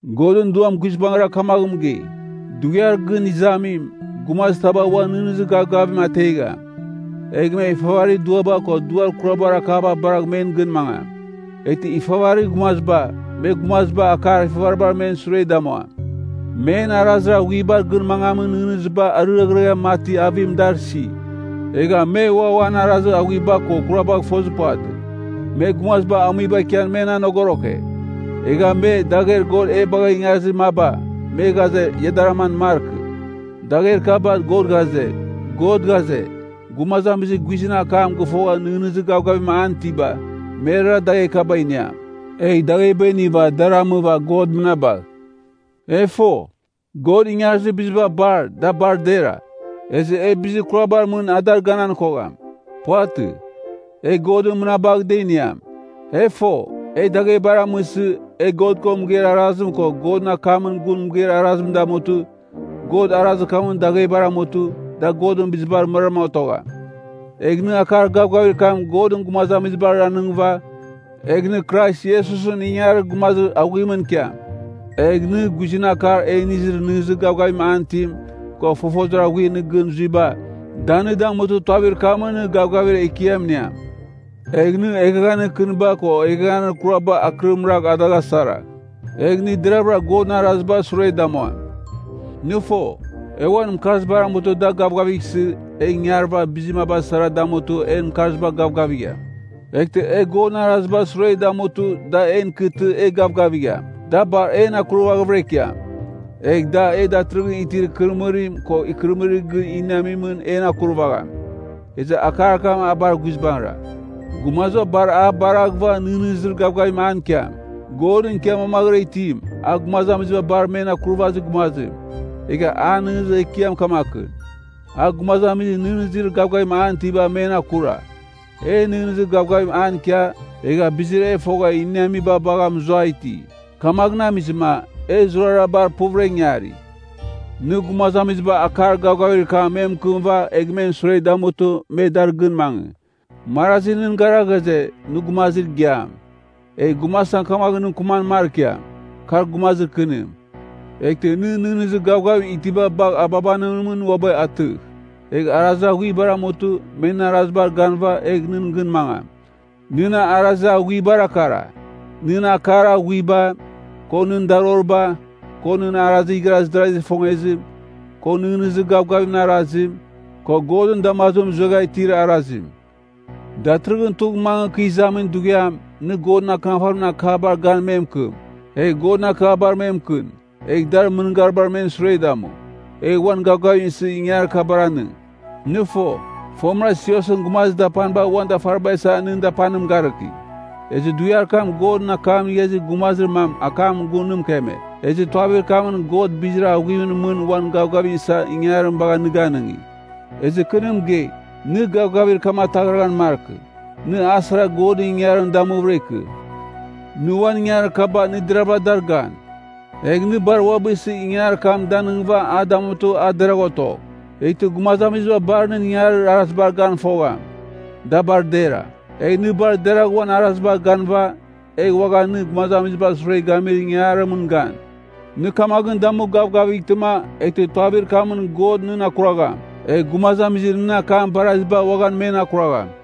Godɨn Duam guizbangɨra kamaghɨn mɨgei, Dughiar Gɨn Izamim, gumazir taba uan nɨghnɨzir gavgaviba ategham. Egh me ifavarir duaba ko duar kurabar akaba baragh men gɨn mangam. Eghtɨ ifavarir gumaziba, me gumaziba akar ifavaribar men sure damuam. Men arazir aghuibar gɨn mangamin nɨghnɨziba ariaghɨre mati avim dar isi, egha me ua uan arazir aghuiba ko kurabagh fozir puvatɨ. Me gumaziba amuiba ikian men anogoroke. Egha me, dagher God e bagha ingarizir maba, me ghaze ia dar aman markɨ. Dagher kaba, God ghaze, gumazamizir guizɨn akam gɨfogha nɨghnɨzir gavgavim an itiba, merara dagher kaba iniam. Egh dagheba iniva dar amɨva God mɨnabagh. E fo, God ingarizir biziba bar, da bar dera. Ezɨ e bizir kurabar mɨn a dar ganan kogham. Puvatɨ. E Godɨn mɨnabagh da iniam. E fo, e daghebar amɨsɨ, e God ko mɨgeir arazim ko Godɨn akamɨn gun mɨgeir arazim damutɨ, God arazir kamɨn daghebar amutɨ, da Godɨn bizibar mɨraram otogham. Egh nɨ akar gavgavir kam Godɨn gumazamizibar anɨngɨva, egh nɨ Krais Iesusɨn ingangarir gumazir aghuimɨn ikiam. Egh nɨ, guizɨn akar e inizir nɨghnɨzir gavgavim an itim, ko fofozir aghuir nɨ gɨn zuiba, da nɨ damutɨ, tuavir kamɨn nɨ gavgavir ekiam iniam. Egh nɨ eghaghanir kɨniba ko eghaghanir kuraba akɨrim ragh a dagh asaragh. Egh nɨ deravɨra Godɨn arazibar sure damuam. Nɨ fo, e uan mɨkarzibar amutɨ da gavgavighsɨ, e ingarɨva bizir maba sara damutɨ en mɨkarziba gavgavigham. Eghtɨ e Godɨn arazibar sure damutɨ da en ikɨtɨ e gavgavigham, da bar en akurvaghvɨra ikiam. Egh da e datɨrɨghɨn itir ikɨrɨmɨrim ko ikɨrɨmɨrir gɨn iniamimɨn en akurvagham. Ezɨ akar kam a bar guizbangɨra. Gumaziba bar a baraghɨva nɨghnɨzir gavgavim an ikiam. Godɨn ikia mamaghɨra itim, a gumazamiziba bar men Akurvazir Gumazim, egha an nɨghnɨzir ekiam kamakɨn, a gumazamizir nɨghnɨzir gavgavim an itiba men akura. E nɨghnɨzir gavgavim an ikia, egha bizir e fogha iniamiba bagha mɨzua iti. Kamaghɨn amizɨma, e zurara bar puvɨra ingari. Nɨ gumazamiziba akar gavgavir kam me mɨkɨmɨva egh men sure damutɨ me dar gɨn mangɨ. Marazi nɨn gara ghaze, nɨ gumazir igiam. Egh gumazitam kamaghɨn nɨ mɨkɨman markiam, kar gumazir kɨnim. Eghtɨ nɨ nɨghnɨzir gavgavim itiba bagh ababanimɨn uabɨ atɨgh. Egh arazir aghuibar amutɨ, me nɨn arazibar ganɨva, egh nɨn gɨn mangam. Nɨn arazir aghuibara kara: nɨn akar aghuiba, ko nɨn daroriba, ko nɨn arazir igharaz darazigh ifongezim, ko nɨghnɨzir gavgavimɨn arazim, ko Godɨn damazimɨn zuegha itir arazim. Datɨrɨghɨn tugh mangɨ kɨ izamin dughiam, nɨ Godɨn Akɨnafarimɨn akabar gan me mɨkɨm, egh Godɨn akabar me mɨkɨn, egh dar mɨngarimɨn men sure damu, egh uan gavgavim isɨ ingangarir kabar anɨng. Nɨ fo, fomɨra siosɨn gumazir dapaniba uan dafariba isa nɨn dapanim garɨki. Ezɨ dughiar kam Godɨn akam inigha izir gumazir mam akamɨn gun nɨ mɨkeme, ezɨ tuavir kamɨn God bizir aghuimɨn mɨn uan gavgavim isa ingangarim bagha nɨ ganɨngi. Ezɨ kɨ nɨ mɨgei, nɨ gavgavir kam ataghraghan markɨ, nɨ a sara Godɨn ingangarim damuvɨra ikɨ. Nɨ uan ingangarir kaba nɨ deravɨra dar gan. Egh nɨ bar uabɨ isɨ ingangarir kam danɨngɨva a damutɨ a deragh otogh. Eghtɨ gumazamiziba bar nɨn ingangarir arazibar gan fogham, da bar dera. Egh nɨ bar deragh uan arazibar ganɨva, egh uaghan nɨ gumazamizibar sure gamir ingangarimɨn gan. Nɨ kamaghɨn damu gavgavightɨma, eghtɨ tuavir kamɨn God nɨn akuragham, egh gumazamizir nɨn akam baraziba uaghan men akuragham.